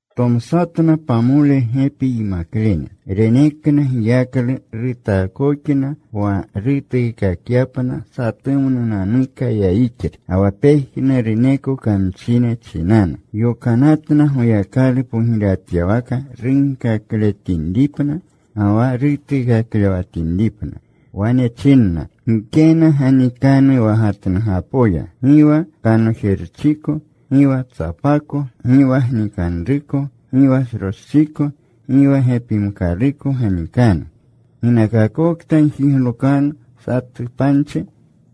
Tomsatna pamole gepi yimaklene. Renekna giyaklu. Rutaakoxna wa rutuukakyapna satumnunanuka yayixlu, ga wa pejnuruneko kamchine chinanu. Yokanatna Goyakalu pogirewatyawaka runkakletinripna, ga wa rutuukaklewatinripna. Wane chinna, “Gikena ganikanu wa gatnugapoya, gi wa kanojerchiko, gi wa tsapako, gi wa gnikanruko, gi wa sroschiko, gi wa gepimkaluko ganikanu. Ginakakokta gjiglokanu satu panchi,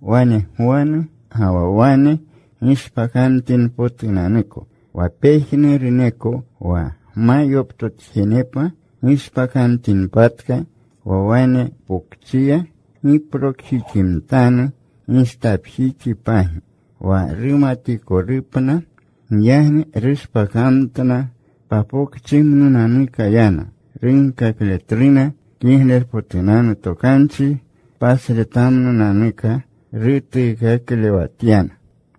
wane gwanu, ga wa wane gishpakamtinpotunanuko. Wa pejnuruneko wa gma yoptotjenepa, gishpakamtinpatka wa wane pokchiya, giplokjiximtanu gistapjixipagi wa rumatikolupna.” Giyagni rushpakamtna. Papokchimnunanuka yana. Runkakletluna Kiglerpotunanu Tokanchi. Pasretamnunanuka rutuukaklewatyana.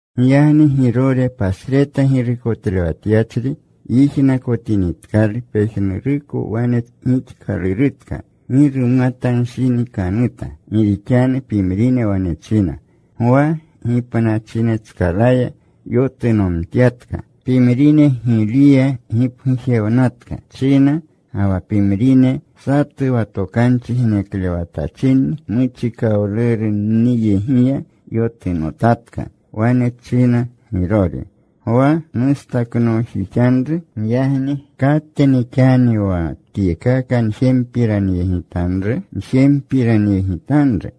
Giyagni Girore pasreta girukotlewatyachri yijnakotinitkalu pejnuruko wane gixkalurutka, gi rumatanshinikanuta, gi rixanu pimrine wane china, “Gwa gipnachinetskalaya yotunomtyatka.” Pimrine, “Giliya gipgujewnatka,” china. Ga wa pimrine, “Satu wa tokanchi geneklewatachinni muchikawlurunniyegiya yotunotatka.” Wane china Girore, “Gwa nustaknoojixanru. Giyagni ¿katni xani wa tyekaka njempiranyegitanru?”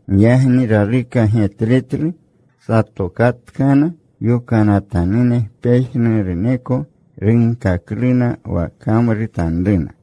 Giyagni raluka getletlu. Satokatkana yokanatanune. Pejnuruko runkakluna wa kamrutanruna.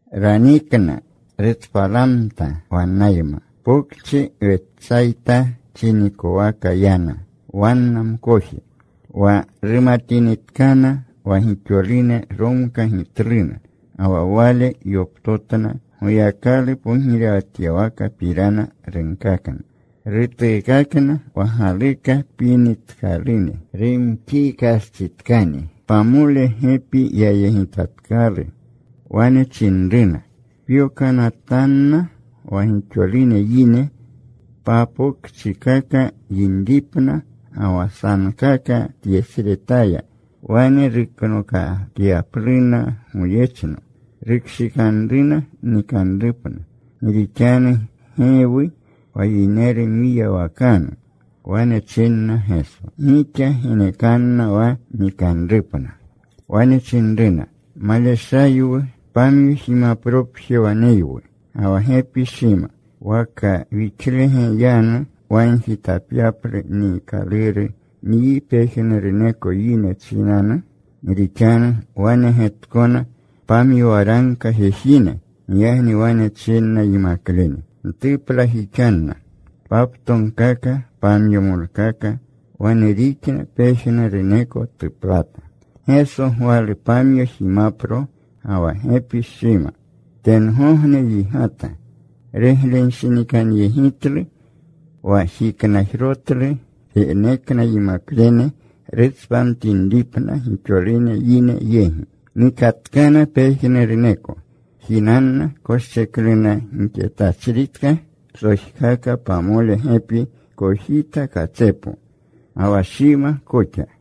Ranikna. Rutspalamta wannayma. Papokchi Wetsayta chinikowaka yana, wanna mkoje. Wa rumatinitkana wa gixolune, romkagitluna. Ga wa Wale yoptotna. Goyakalu pogirewatyawakapirana runkakna. Rutuukakna wa galuka pinitkalune. Rumxiikastsitkani, pamole gepi yayegitatkalu. Wane chinruna, “Pyokanatanna wa gixolune yine papokchikaka yinripna ga wa sankaka tyesretaya. Wane ruknokakyapluna goyechno. Rukshikanruna nikanrupna. Gi rixanu gewwu wa yineru mwiyawakanu.” Wane chinna Geso, “Gixa genekanna wa nikanrupna.” Wane chinruna, “Maleshayanwu. Pamyo jimapropje waneywu, ga wa gepi shima. ¿Waka wixlege yanu wagjitapyaplu niikaluru nyi pejnuruneko yine chinanu?” Gi rixanu wanegetkona pamyo waragka jejine. Giyagni wane chinna yimaklene, “Ntuplajixanna paptogkaka pamyomolkaka.” Wane rixna. Pejnuruneko tuplata. Geso gwalu pamyo jimapro ga wa gepi shima. Tengogne yigata. Ruglenshinikanyegitlu. Wa jiknajrotlu. Renekna yimaklene rutspamtinripna gixolune yine yegi. Nikatkana pejnuruneko. Jinanna. Koschekluna gixetachritka psojkaka pamole gepi kojita katsepo, ga wa shima koxa.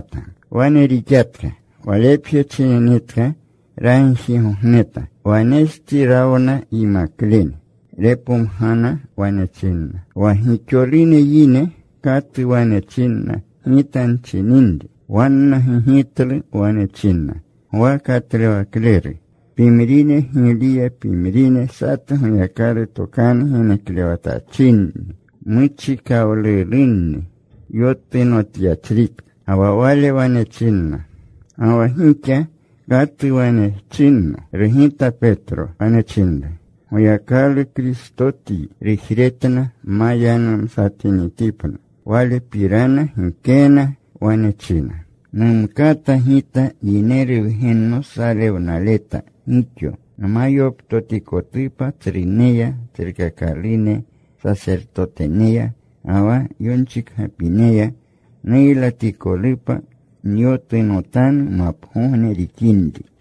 Wane rixatka. Walepje chininitka ragjigogneta. Wanestsi rawna yimaklene. Repomgana. Wane chinna, “¿Wa gixolune yine katu wane chinna Gita nchininri?” Wanna gigitlu. Wane chinna, “Gwa Katlewakleru. Pimrine, Giliya. Pimrine, satu Goyakalu tokanu geneklewatachinni muchikawlurunni yotunotyachritka.” Ga wa Wale wane chinna, “Ga wa gixa ¿katu wane chinno?” Rugita Petro. Wane chinru, “Goyakalu Kristotyi.” Rujretna ma yanumsatinitipna Walepirana gikena. Wane china, “Numkata Gita Yineru Wgenno salewnaleta gixo, nma yoptotikotupa tsruneya, tsrukakalune sasertoteneya, ga wa yonchikgapineya; nuylatikolupa. Nyotunotanu mapagogne rixinri.”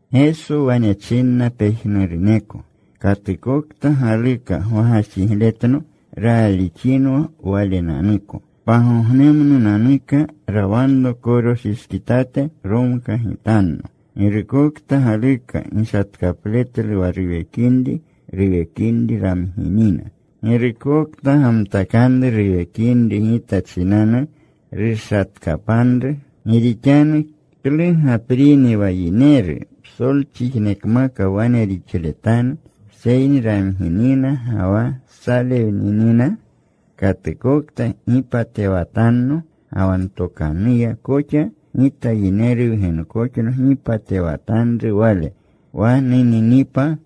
Geso wane chinna pejnuruneko, “Katukokta galuka gwagajxigletno raalixinwa walenanuko. Pagognemnunanuka rawanro koroshishkitate. Romkagitanno. Girukokta galuka gishatkapletlu wa ruwekinri, ruwekinri ramginina. Girukokta gamtakanru ruwekinri Gita chinanu rushatkapanru. Gi rixanu ¿klu gaprini wa yineru psolchijikmaka wane rixletanu, seyni ramginina ga wa salewninina? Katukokta gipatewatanno ga wa ntokanuya koxa, Gita Yineru Wgenkoxno gipatewatanru wale wa nuninipa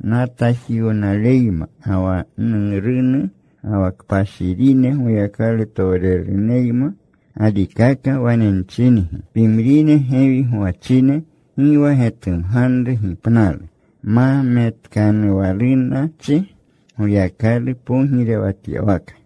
natajiwnaleyma ga wa Nurunu, ga wa kpashirine Goyakalutowrerunenuyma. Galikaka wane nchingi, pimrine gewi gwachine gi wa getumganru gipnalu ma metkanuwalunachi Goyakalu pogirewatyawaka.”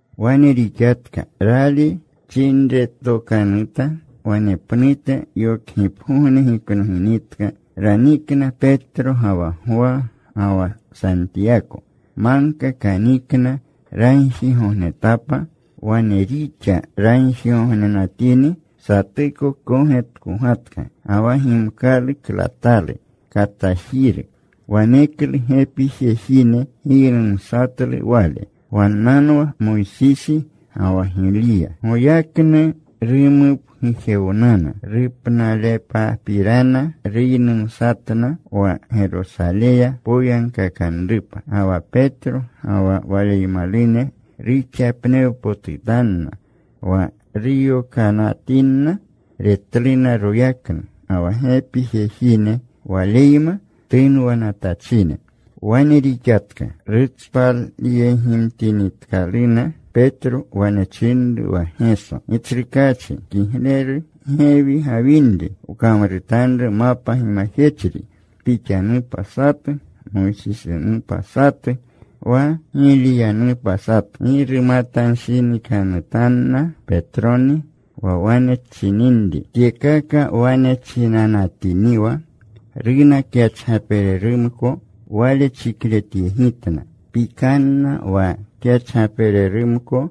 Wane rixatka. Rali chinretokanuta. Wanepnute yokgipgogne giknoginitka, ranikna Petro ga wa Gwa ga wa Santiyako. Magka kanikna, ragjigognetapa. Wane rixa. Ragjigognenatini satuko kogetkogatka. Ga wa gimkalu klatalu, katajiru. Waneklu gepi jejine giynumsatlu Wale. Wannanwa Moysisi ga wa Giliya. Goyaknu rumupgujewnana. Rupnalepapirana ruynumsatna, wa Gerosaleya poyagkakanrupa. Ga wa Petro ga wa waleymalune ruxapnewpotutanna. Wa ruyokanatinna retluna royaknu ga wa gepi jejine Waleyma tunwanatachine. Wane rixatka. Rutspalyegimtinitkaluna, Petro wane chinru wa Geso, “Gitsrukaachi, kigleru gewi gawinri. Wkamrutanru mapa gimajechri. Pixanupa satu, Moysisinupa satu, wa Giliyanupa satu.” Gi rumatanshinikanutinna Petroni wa wane chininri. Tyekaka wane chinanatiniwa, runa kyachgapererumko. Wale chikletyegitna. Pikanna wa kyachgapererumko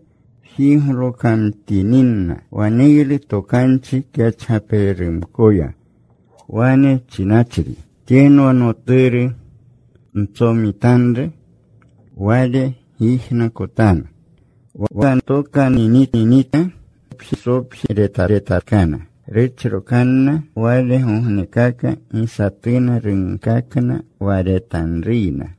jiglokamtininna. Waneylu tokanchi kyachgapererumkoya, wane chinachri, “Tyenwa Noturu ntsomitanru. Wale gyijnakotanu.” Wa tokanuwninitka, Gesopje retatkana. Ruchrokanna. Walegognekaka gi satuna runkakna wa retanruyna.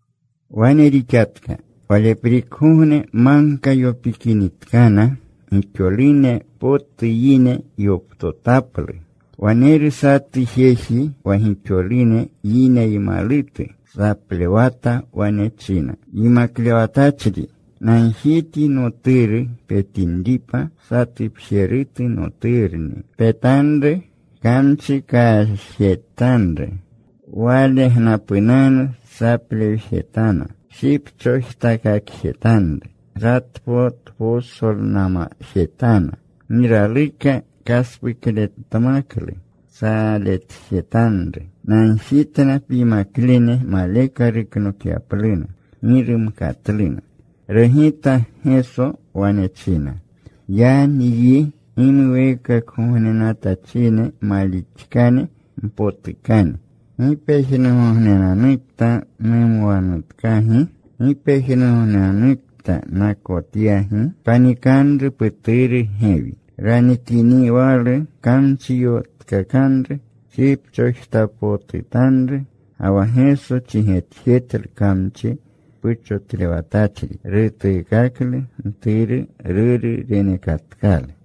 Wane rixatka. Waleprikgogne magka yopikinitkana, gixolune potu yine yoptotaplu. Waneru satu jeji wa gixolune yineymalutu. Saplewata. Wane china, “Yimaklewatachri, nagjityi noturu petinripa. Satupjerutu noturni. Petanru. Kamchi kashjetanru. Walegnapunanu saplewjejetana. Shipchojtakakjetanru. Ratpotposolnamjetana. Gi raluka kaspukletmaklu. Saletjetanru. Nagjitna pyimaklene maleka ruknokyapluna. Gi rumkatluna.” Rugita Geso. Wane china, “¡Ya nyi gimuweekakgognenatachine malixkane, mpotukane! ¿Gi pejnugognenanukta numwanutkagi? ¿Gi pejnugognenanukta nakotyagi? Panikanru puturu gewi.” Ranikiniwalu, kamchi yotkakanru. Shipchojtakakpotutanru. Ga wa Geso chigetjetlu kamchi puchotlewatachri. Rutuukaklu mturu. Ruru renekatkalu.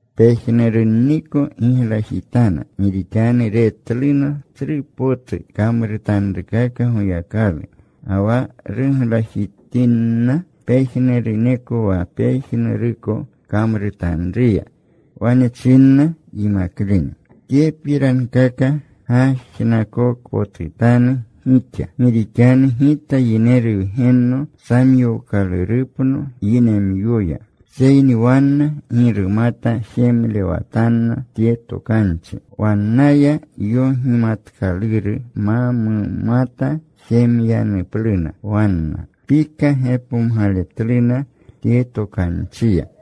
Pejnurunniko giglajitana gi rixanu retluna tsru potu kamrutanrukaka Goyakalu. Ga wa ruglajinatinna pejnuruneko wa pejnuruko kamrutanruya, wane chinna yimaklene, “Tyepirankaka gajnakokpotutanu gixa. Gi rixanu Gita Yineru Wgenno samyookalurupno yinemyoya.” Seyni wanna gi rumata jemlewatanna tye tokanchi. Wannaya yogimatkaluru ma mumata jemyanupluna wanna. Pika gepomgaletluna tye tokanchiya.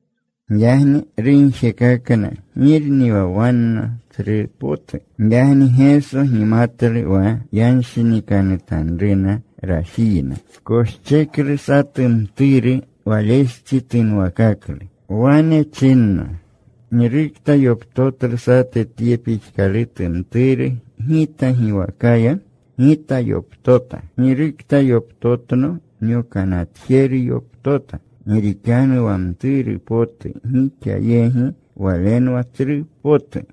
Giyagni rugjekakna girni wa wanna tsrupotu. Giyagni Geso gimatlu wa yanshinikanutanruna rajiyna. Koscheklu satu mturu. Walestsi tunwakaklu. Wane chinna, “Girukta yoptotlu satu tye pixkalutu mturu, Gita giwakaya, Gita yoptota. Girukta yoptotno nyokanatjeru yoptota. Gi rixanu wa mturu potu gixa yegi, walenwa tsru potu.”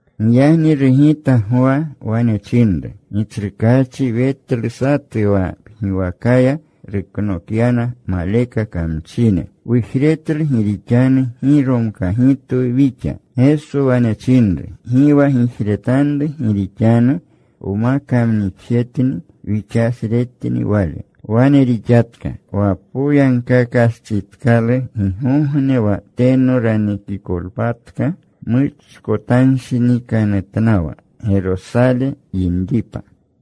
Giyagni rugita Gwa. Wane chinru, “Gitsrukaachi, wetlu satu wa pgiwakaya ruknokyana maleka kamchine. Wujretlu gi rixanu gi romkagitwu wixa.” Geso wane chinru, “Gi wa gijretanru. Gi rixanu wma kamnixjetni wixasretni wale.” Wane rixatka. Wa poyagkakastsitkalu gigogne wa teno ranikolpatka muchkotanshinikanutnawa Gerosale yinripa.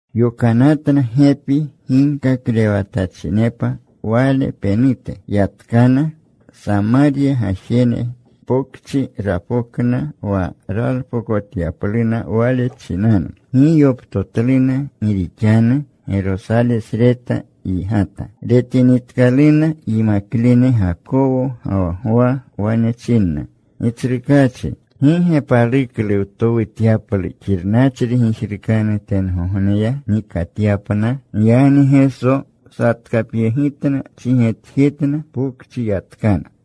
Yokanatna gepi ginkaklewatachinepa Wale penute. Yatkana. Samarya gajene pokchi rapokna wa ralpokotyapluna Wale chinanu. Gi yoptotluna gi rixanu Gerosalesreta yigata. Retinitkaluna yimaklene Gakowo ga wa Gwa, wane chinna, “Gitsrukaachi, ¿gi ge paluklu wtowutyaplu xirnachri gijrukanu tengogneya, nikatyapna?” Giyagni Geso satkapyegitna. Chigetjetna. Papokchi yatkana.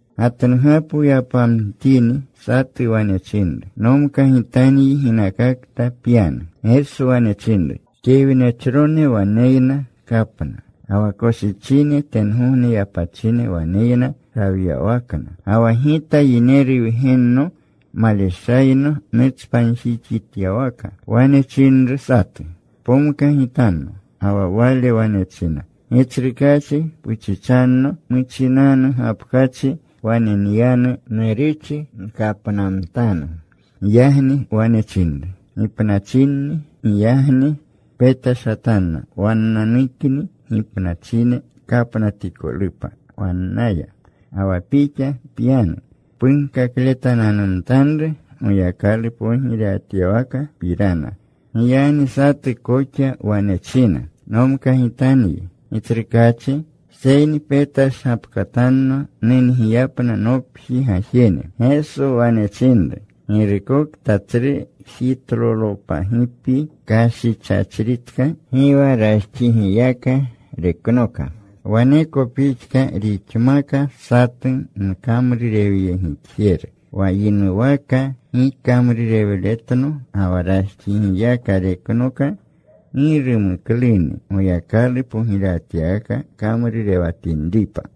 Gatnugapo yapamtini, satu wane chinru, “Nomkagitanyi ginakakta pyanu.” Geso wane chinru, “Kewnechrone waneyna kapna. Ga wa koshichine tengogne yapachine waneyna rawyawakna. Ga wa Gita Yineru Wgenno maleshayno nutspanjiwutyawaka.” Wane chinru satu, “Pomkagitanno.” Ga wa wale wane china, “Gitsrukaachi, puchichanno muchinanu gapkachi wane nyanu. Nuruchi nkapnamtanu.” Giyagni wane chinru, “Gipnachinni. Giyagni petashatanna wannananukni gipnachine kapnatikolupa wannaya. Ga wa pixa pyanu. Punkakletananumtanru Goyakalu pogirewatyawakapirana.” Giyagni satu koxa wane china, “Nomkagitanyi, Gitsrukaachi. Seyni petashgapkatanno nungiyapna nopji gajene.” Geso wane chinru, “Girukokta tsru jitlolopagipi kashichachritka, gi wa rajxigiyaka reknoka. Waneko pixka rixmaka satu nkamrurewyegitjeru; wa yinuwaka gikamrurewletno ga wa rajxigiyaka reknoka, gi rumukluni Goyakalu pogirewatyawaka kamrurewatinripa.”